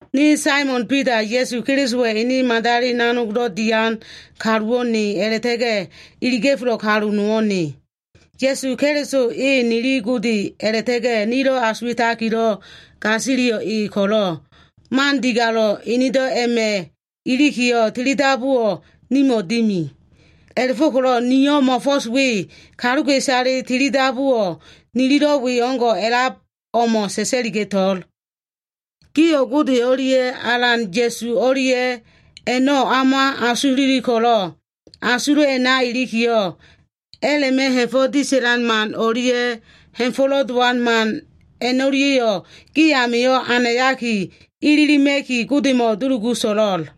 Ne Saimon Bida, Ya꞉su Kelisowa꞉ ene madali nanogdo꞉ dian kaluwo꞉ ne a꞉la꞉ta꞉ga꞉ enedo꞉ iliga꞉felo꞉ kaluwo꞉ nowo꞉ ne. Ya꞉su Keliso e nili Gode a꞉la꞉ta꞉ga꞉ nilo꞉ asuwa꞉takilo꞉ gasiliyo꞉ e ko꞉lo꞉, man digalo꞉le enedo꞉ a꞉ma꞉ ilikiyo꞉, tilidabuwo꞉ nimo꞉ dimi. A꞉la꞉fo꞉ko꞉lo꞉ niyo꞉ mo꞉fo꞉s we kaluka꞉isale tilidabuwo꞉ nililo꞉ we o꞉ngo꞉ a꞉lab o꞉mo꞉ sa꞉sa꞉liga꞉to꞉l. Gio꞉ Gode o꞉lia꞉ Alan Ya꞉su o꞉lia꞉ a꞉no꞉ o꞉ma asululi ko꞉lo꞉, asulo꞉ a꞉na ilikiyo꞉, a꞉la꞉ma꞉ ha꞉fo꞉ disa꞉lan man o꞉lia꞉ ha꞉fa꞉nolo dowan man a꞉no꞉lia꞉yo꞉ gi amio꞉ anayaki ililima꞉ki, Godemo꞉ dulugu so꞉lo꞉l.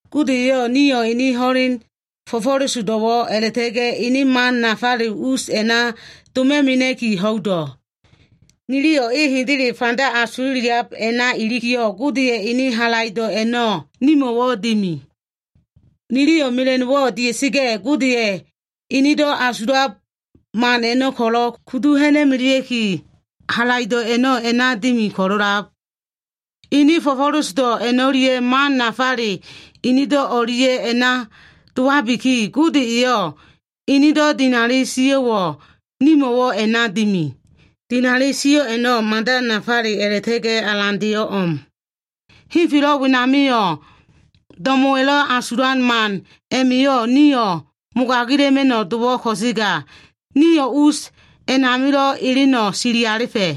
Gode eyo꞉ nio꞉ ene ho꞉len fo꞉fo꞉lesodo꞉wo꞉ a꞉la꞉ta꞉ga꞉ ene man nafale us a꞉na doma꞉ mena꞉ki ho꞉ido꞉. Niliyo꞉ e hendele fanda asululiab a꞉na ilikiyo꞉, Godeya꞉ ene halaido꞉ a꞉no꞉ nimo꞉wo꞉ dimi. Niliyo꞉ mela꞉no꞉wo꞉ dia꞉sa꞉ga꞉, Godeya꞉ enedo꞉ asulab man a꞉no꞉ ko꞉lo꞉ kudu ha꞉na꞉melea꞉ki, halaido꞉ a꞉no꞉ a꞉na dimi ko꞉lo꞉lab. Ene fo꞉fo꞉lesodo꞉ a꞉no꞉lia꞉ man nafale enedo꞉ o꞉lia꞉ a꞉na dowabiki, Gode eyo꞉ enedo꞉ dinali sio꞉wo꞉ nimo꞉wo꞉ a꞉na dimi. Dinali sio꞉ a꞉no꞉ mada nafale a꞉la꞉ta꞉ga꞉ alandeyo꞉ o꞉m. Henfelo꞉ wenamio꞉ do꞉mo꞉wa꞉lo꞉ asulan man a꞉ma꞉yo꞉ nio꞉ mogagila꞉ma꞉no꞉ dowo꞉ ko꞉sega, nio꞉ us a꞉namilo꞉ eleno꞉ sili alifa꞉.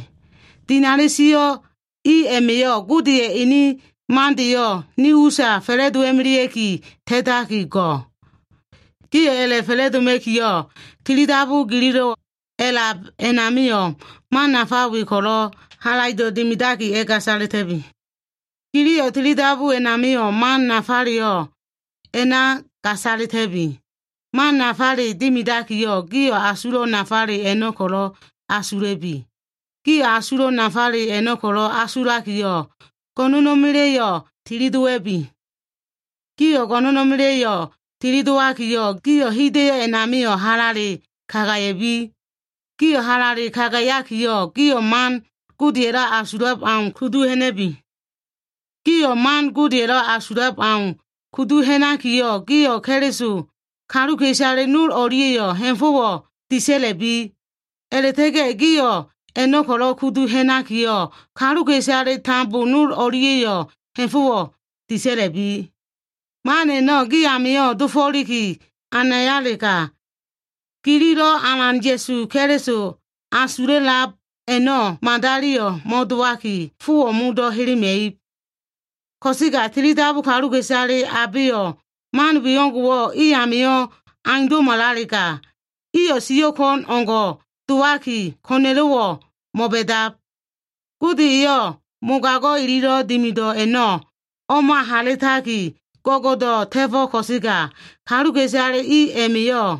Dinali sio꞉ i a꞉ma꞉yo꞉, Godeya꞉ ene mandeyo꞉ ni usa fa꞉la꞉dowa꞉melea꞉ki ta꞉taki go꞉. Gio꞉ a꞉la꞉fa꞉la꞉doma꞉kiyo꞉, tilidabu gililo꞉ a꞉lab a꞉namio꞉ man nafa we ko꞉lo꞉ halaido꞉ dimidaki a꞉gasalita꞉bi. Gililo꞉ tilidabu a꞉namio꞉, man nafaleyo꞉lo꞉ a꞉na gasalita꞉bi. Man nafale dimidakiyo꞉, gio꞉ asulo꞉ nafale a꞉no꞉ ko꞉lo꞉ asula꞉bi. Gio꞉ asulo꞉ nafale a꞉no꞉ ko꞉lo꞉ asulakiyo꞉, go꞉no꞉na꞉ma꞉la꞉yo꞉ tilidowa꞉bi. Gio꞉ go꞉no꞉na꞉ma꞉la꞉yo꞉ tilidowakiyo꞉, gio꞉ hida꞉yo꞉ a꞉namio꞉ halale kagaya꞉bi. Gio꞉ halale kagayakiyo꞉, gio꞉ man Godeya꞉lo꞉ asulab au kudu ha꞉na꞉bi. Gio꞉ man Godeya꞉lo꞉ asulab au kudu ha꞉nakiyo꞉, gio꞉ Keliso kaluka꞉isale nol o꞉lia꞉yo꞉ ha꞉fo꞉wo꞉ disa꞉la꞉bi. A꞉la꞉ta꞉ga꞉ gio꞉ a꞉no꞉ ko꞉lo꞉ kudu ha꞉nakiyo꞉, kaluka꞉isale tambo nol o꞉lia꞉yo꞉lo꞉ ha꞉fo꞉wo꞉ disa꞉la꞉bi. Man a꞉no꞉ gi amio꞉ dofo꞉liki anayalega, gililo꞉ Alan Ya꞉su Keliso asululiab a꞉no꞉ madaliyo꞉ mo꞉dowaki, fowo꞉ modo꞉ helema꞉ib. Ko꞉sega tilidabu kaluka꞉isale abeyo꞉ man we o꞉ngo꞉wo꞉ i amio꞉ aundo꞉malalega, iyo꞉ siyo꞉ ko꞉n o꞉ngo꞉ dowaki, ko꞉na꞉lo꞉wo꞉ mo꞉ba꞉dab. Gode eyo꞉ mogago꞉ ililo꞉ dimido꞉ a꞉no꞉ o꞉ma halitaki, go꞉go꞉do꞉ ta꞉fo꞉ ko꞉sega, kaluka꞉isale i a꞉ma꞉yo꞉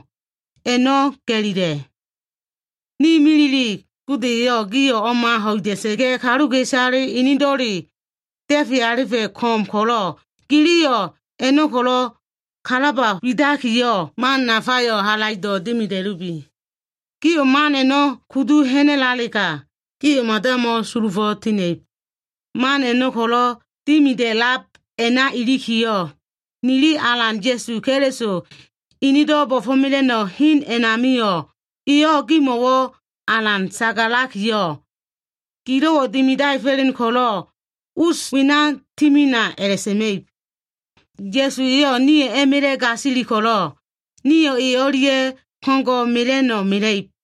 a꞉no꞉ ga꞉lila꞉. Ne milile, Gode eyo꞉ gio꞉ o꞉ma ho꞉ida꞉sa꞉ga꞉, kaluka꞉isale enedo꞉leyo꞉ da꞉fe alifa꞉ ko꞉m ko꞉lo꞉, giliyo꞉ a꞉no꞉ ko꞉lo꞉ kalaba widakiyo꞉, man nafayo꞉ halaido꞉ dimida꞉lubi. Gio꞉ man a꞉no꞉ kudu ha꞉nalega, gio꞉ mada mo꞉sulufo꞉ tina꞉ib. Man a꞉no꞉ ko꞉lo꞉ dimida꞉lab a꞉na ilikiyo꞉, nili Alan Ya꞉su Keliso enedo꞉ bo꞉fo꞉mela꞉no꞉ hen a꞉namio꞉, eyo꞉ gimo꞉wo꞉ alan sagalakiyo꞉, “Gilo꞉wo꞉ dimidaefo꞉len ko꞉lo꞉ us wena timina” a꞉la꞉sa꞉ma꞉ib. Ya꞉su eyo꞉ nio꞉ a꞉ma꞉la꞉ gasili ko꞉lo꞉, nio꞉ e o꞉lia꞉ ko꞉ngo꞉ mela꞉no꞉ mela꞉ib.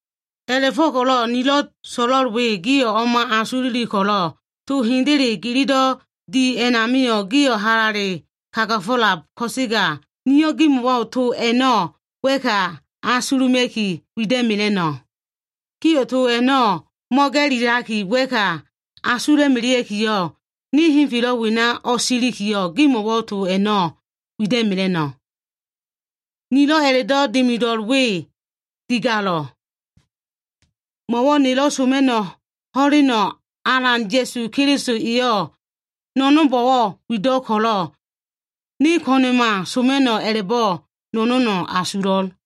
A꞉la꞉fo꞉ko꞉lo꞉ to nilo꞉ so꞉lo꞉l we gio꞉ o꞉ma asululi ko꞉lo꞉, to hendele gililo꞉ di a꞉namio꞉, gio꞉ halale kagafo꞉lab ko꞉sega, nio꞉ gimo꞉wo꞉ to a꞉no꞉ wa꞉ka asuluma꞉ki wida꞉mela꞉no꞉. Gio꞉ to a꞉no꞉ mo꞉ga꞉lilaki wa꞉ka asula꞉melea꞉kiyo꞉, ne henfelo꞉ wena o꞉silikiyo꞉, gimo꞉wo꞉ to a꞉no꞉ wida꞉mela꞉no꞉. Nilo꞉ a꞉la꞉do꞉ dimido꞉l we digalo꞉. Mo꞉wo꞉ nelo꞉ soma꞉no꞉ ho꞉leno꞉ Alan Ya꞉su Keliso eyo꞉ no꞉no꞉nbo꞉wo꞉ wido꞉ ko꞉lo꞉, ne ko꞉na꞉ma soma꞉no꞉ a꞉la꞉bo꞉ no꞉no꞉no꞉ asulo꞉l.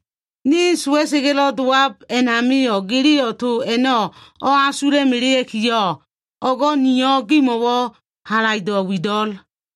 Ne sowa꞉sa꞉ga꞉lo꞉ dowab a꞉namio꞉, giliyo꞉ to a꞉no꞉ o꞉asula꞉ melea꞉kiyo꞉, o꞉go꞉ niyo꞉ gimo꞉wo꞉ halaido꞉ wido꞉l.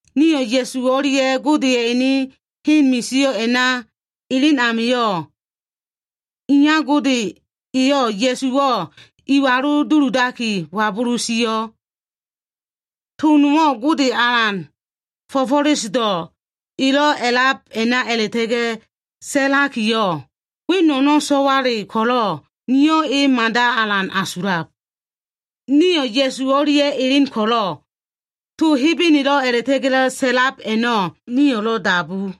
Nio꞉ Ya꞉su o꞉lia꞉ Godeya꞉ ene hen misio꞉ a꞉na elen amio꞉, Iya Gode eyo꞉ Ya꞉suwo꞉ iwalu duludaki wabulu sio꞉. To nowo꞉ Gode Alan fo꞉fo꞉lesodo꞉ elo꞉ a꞉lab a꞉na a꞉la꞉ta꞉ga꞉ sa꞉lakiyo꞉, “We no꞉no꞉ so꞉wale ko꞉lo꞉, niyo꞉ e mada alan asulab.” Nio꞉ Ya꞉su o꞉lia꞉ elen ko꞉lo꞉, to Hebenelo꞉ a꞉la꞉ta꞉ga꞉lo꞉ sa꞉lab a꞉no꞉ nio꞉lo꞉ dabu.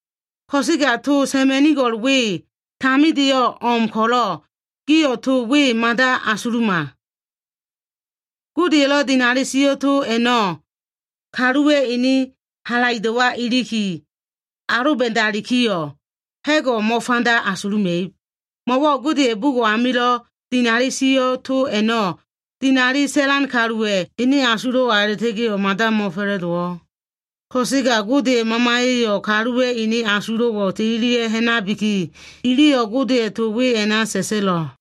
Ko꞉sega to sa꞉ma꞉nigo꞉l we tamindeyo꞉ o꞉m ko꞉lo꞉, gio꞉ to we mada asuluma. Godeya꞉lo꞉ dinali sio꞉ to a꞉no꞉ kaluwa꞉ ene halaido꞉wa꞉ iliki aloba꞉dalikiyo꞉, ha꞉go꞉ mo꞉fanda asuluma꞉ib. Mo꞉wo꞉ Godeya꞉ bugo꞉ amilo꞉ dinali sio꞉ to a꞉no꞉, dinali sa꞉lan kaluwa꞉ ene asulo꞉wa a꞉la꞉ta꞉ga꞉yo꞉ mada mo꞉fa꞉la꞉dowo꞉. Ko꞉sega Godeya꞉ Mamaya꞉yo꞉ kaluwa꞉ ene asulo꞉wo꞉ tililia꞉ ha꞉nabiki, iliyo꞉ Godeya꞉ to we a꞉na sa꞉sa꞉lo꞉.